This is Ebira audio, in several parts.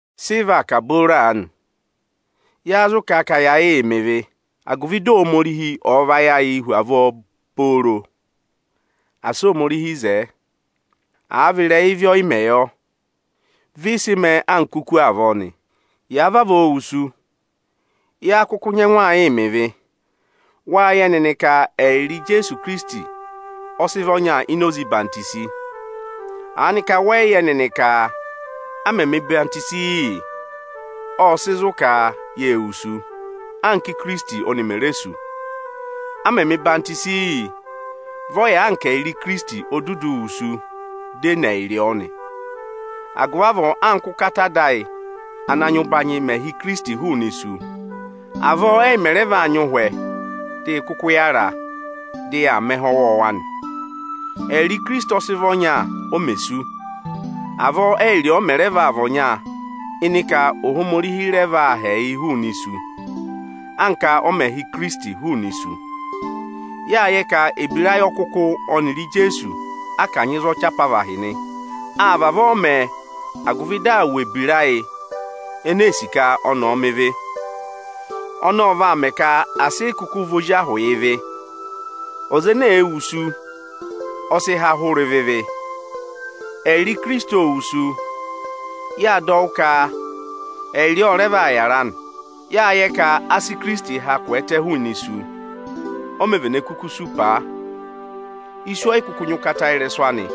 Sị ị vaa kà booro aanị? Yáá zụ kà ka ya yịị mẹ ịvị agụvị dị Ohomorihi ọ̀ yịị vayị ayịị hu avọọ pooro? Asị Ohomorihi zẹẹ! Àa vị ịrẹyị ịvị ọyịmẹ̀ yọ, vị ị sị mẹẹ anka oku ene sú avọọ nị. Yàa vavọọ wusu, yáá kụkụ nyẹngụ aa yịị mẹ ịvị? Wâ yẹ nịnị ka ẹyịrị Ijeesu Ikirisiti ọ sị vị ọnya ini oze ọyịhwenyi. Aanị ka wẹ yị yẹ nịnị ka, a mẹ mẹ̀ ọyịhwọzenyi yị, ộ sị zụ̀ ka yê wusu, anka Ikirisiti ọnị mè re sú? A mẹ mẹ̀ ọyịhwọzenyi yị, vị ọ yà anka ẹyịrị Ikirisiti o dudu wusu, dị e ne ẹyịrị ọ nị. Agụvị avọọ anka ụ́kata Ada ayị ana nyị ụbanyị mẹ̀ ha Ikirisiti hụụnị isu, avọọ ẹ́yị mẹ̀ rẹ vaa nyị ụhwẹ dị ị kụkụ yàra, dị yaa mẹ ẹhẹ ọwọọwa nị. Ẹyịrị Ikirisiti ọ̀ọ sị vị ọnya o mè sú, avọọ ẹyịrị ọọ mẹ rẹ vaa vị ọnya ịnị ka Ohomorihi rẹ vaa ha ẹyịị hụụnị isu, anka ọ mẹ̀ ha Ohinọyị ọnị ọ nyị ka ọ̀ dọ yị há hụụnị isu. Yâ yẹ ka ebira ayị ọkụkụ ọnịrị Ijeesu a kanyị za ọchị apavahị nị. Â vavọọ mẹ, agụvị dị wụ ebira ayị eneē sì ka ọnị ọ̀ọ mẹ ịvị. Ọnọọ vaa ka asị ị kụkụ vị ozi ahụ yị ịvị. Ọza ene wusu, ọ sị há hụrẹ ụvọ ịvị. Ẹyịrị Ikirisiti òo wusu, yâ dọ wụ́ ka ẹyịrị ọ rẹ vaa yàra nị. Yâ yẹ ka asị Ikirisiti kwẹẹtẹ hụụnị isu, o mē vene kuku sú paa. Isu ọ yị kụkụ nyị ụkata ịrẹsụ anị.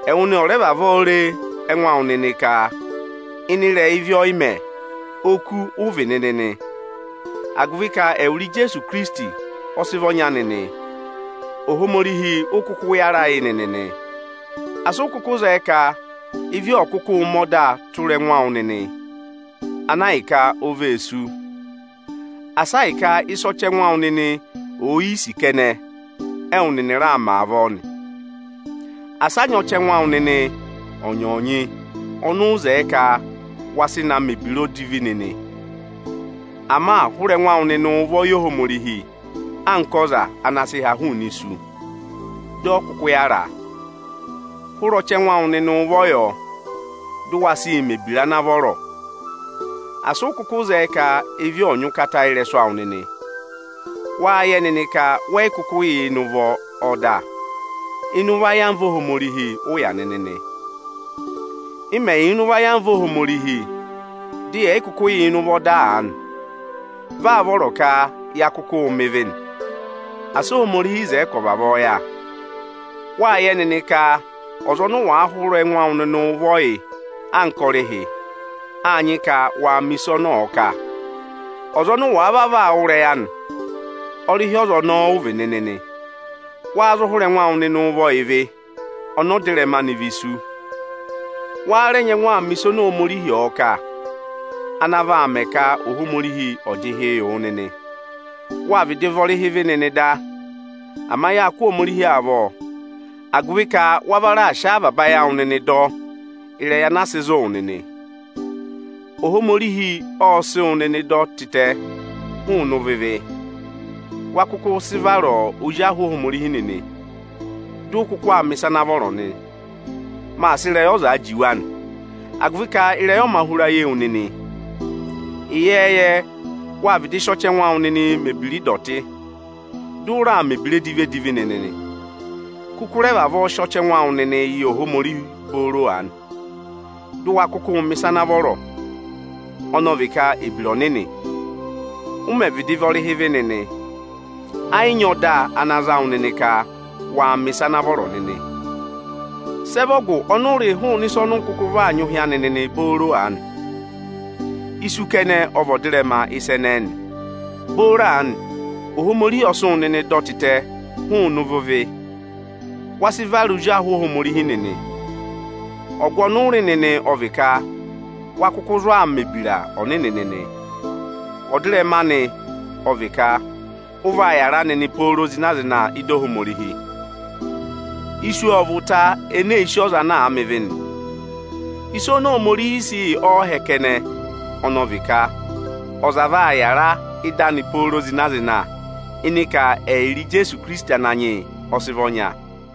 Ẹwụ nịnị ọ̀ rẹ vavọọ re ẹngụ awụ nịnị ka ịnị ịrẹyị ịvị ọyịmẹ̀, oku ụ vị nịnị nị! Agụvị ka ẹwụrị Ijeesu Ikirisiti ọ sị vị ọnya nịnị, Ohomorihi ụ kụkụ yàra yị nịnị nị. Asị ụ kụkụ zẹẹ ka ịvị ọ̀ kụkụụ mẹ ọdaa tụra ẹngụ awụ nịnị, ana ahịka o vee sú! Asa ahịka ịsị ọchẹngụ awụ nịnị òo yi sì kẹnẹ, ẹwụ nịnị raa mẹ avọọ nị! Asị a nyị ọchẹngụ awụ nịnị ọnyọọnyị ọnị ụ zẹẹ ka wa sị na mẹ̀ ebira odivi nịnị! Ama hụrẹ ẹngụ awụ nịnị ụvọ yị Ohomorihi anka ọza anaa sị ha hụụnị isu dị ọ kụkụ yàra! Hụrẹ ọchẹngụ awụ nịnị ụvọ yọ, dị waa sịị mẹ̀ ebira ana vọrọ! Asị ụ kụkụ zẹẹ ka ịvị ọ̀ nyị ụkata ị́rẹsụ awụ nịnị! Wáa yẹ nịnị ka wẹ yị kụkụ yà ịnị ụvọ ọda, ịnị ụvọ ayamva Ohomorihi ụ yà nịnị nị. Ị́ mẹ̀ yà ịnị ụvọ ayamva Ohomorihi, dị yẹ̀ yị kụkụ yàa ịnị ụvọ ọda aanị, vị áá vọrọ ka ya kụkụụ̄ mẹ ịvị nị? Asị Ohomorihi zẹẹ ka ọ̀ vavọọ yà! Wáa yẹ nịnị ka ọza ọnị ụ wàaa hụrẹ ẹngụ awụ nịnịị ụvọ yị anka ọrịhị, áa nyị ka waa mẹ̀ ịsa ọnị ọ̀ọ kà. Ọza ọnị ụ wàa vavọọ aa wụ́ ịrẹyị anị, ọrịhị ọza ọnọọ ụ vị nịnị nị. Wa zụ hụrẹ ẹngụ awụ ụvọ yị ịvị, ọnị ọdịrẹma anị vị isu; wa rẹ nyẹngụ aa mẹ ịsị Ohomorihi ọ̀ọ kà, ana vaa mẹ ka Ohomorihi ọ̀ jị ịhị wụ nịnị. Wâ vịdị vị ọrịhị ịvị nịnị da. Ama yáa kụ́ Ohomorihi avọ, agụvị ka wa va raà sị avaba ayị awụ nịnị dọ ịrẹyị ana aa sịị zụ̀ wụ nịnị. Ohomorihi ọ sị wụ nịnị dọ tịtẹ hụụnị ụvọ ịvị; wa kụkụ sị vara ozi ahụ Ohomorihi nịnị, dị ụ kụkụ aa mẹ̀ ịsa ana vọrọ nị. Maa sị ịrẹyị ọzaa juwe anị, agụvị ka ịrẹyị ọ mā hụra ye wu nịnị. Ịyẹẹyẹ, wâ vịdị sị ọchẹngụ awụ nịnị mẹ̀ ebira ịdọtị, dị ụ raa mẹ̀ ebira edivi-edivi nịnị nị. Kụkụ rẹ vavọọ sị ọchẹngụ awụ nịnị yị Ohomorihi booro aanị, dụ wa kụkụụ mẹ̀ ịsa ana vọrọ, ọnọọ vị ka ebira ọnịnị! Ụ mẹ̀ vịdị vị ọrịhị ịvị nịnị, ẹ yị nyị ọda ana za wụ nịnị ka wa mẹ̀ ịsa ana vọrọ nịnị. Sị ẹ vị ọgụ ọnị ụ rị hụụnị ịsa ọnị ụ kụkụ vaa nyị ụhị anị nịnị booro aanị? Isu kẹnẹ ọ vị ọdịrẹma ịsa ẹnẹẹ nị. Booro aanị, Ohomorihi ọ sị wụ nịnị dọ tịtẹ hụụnị ụvọ ịvị, wa sị vara ozi ahụ Ohomorihi nịnị. Ọgụ ọnị ụ rị nịnị ọ vị ka wa kụkụ zụ aa mẹ̀ ebira ọnịnị nịnị. Ọdịrẹma anị ọ vị ka ụ vaa yàra nịnị pooro zịna-zịna ị́da Ohomorihi. Isu ọ vị ụta eneē si ọza ana mẹ ịvị nị. Ịsa oni Ohomorihiī sị yị ọọhẹ kẹnẹ ọnị vị ka ọza vaa yàra ị́da anị pooro zịna-zịna ịnị ka ẹyịrị Ijeesu Ikirisiti Ananyị yị ọ sị vị ọnya.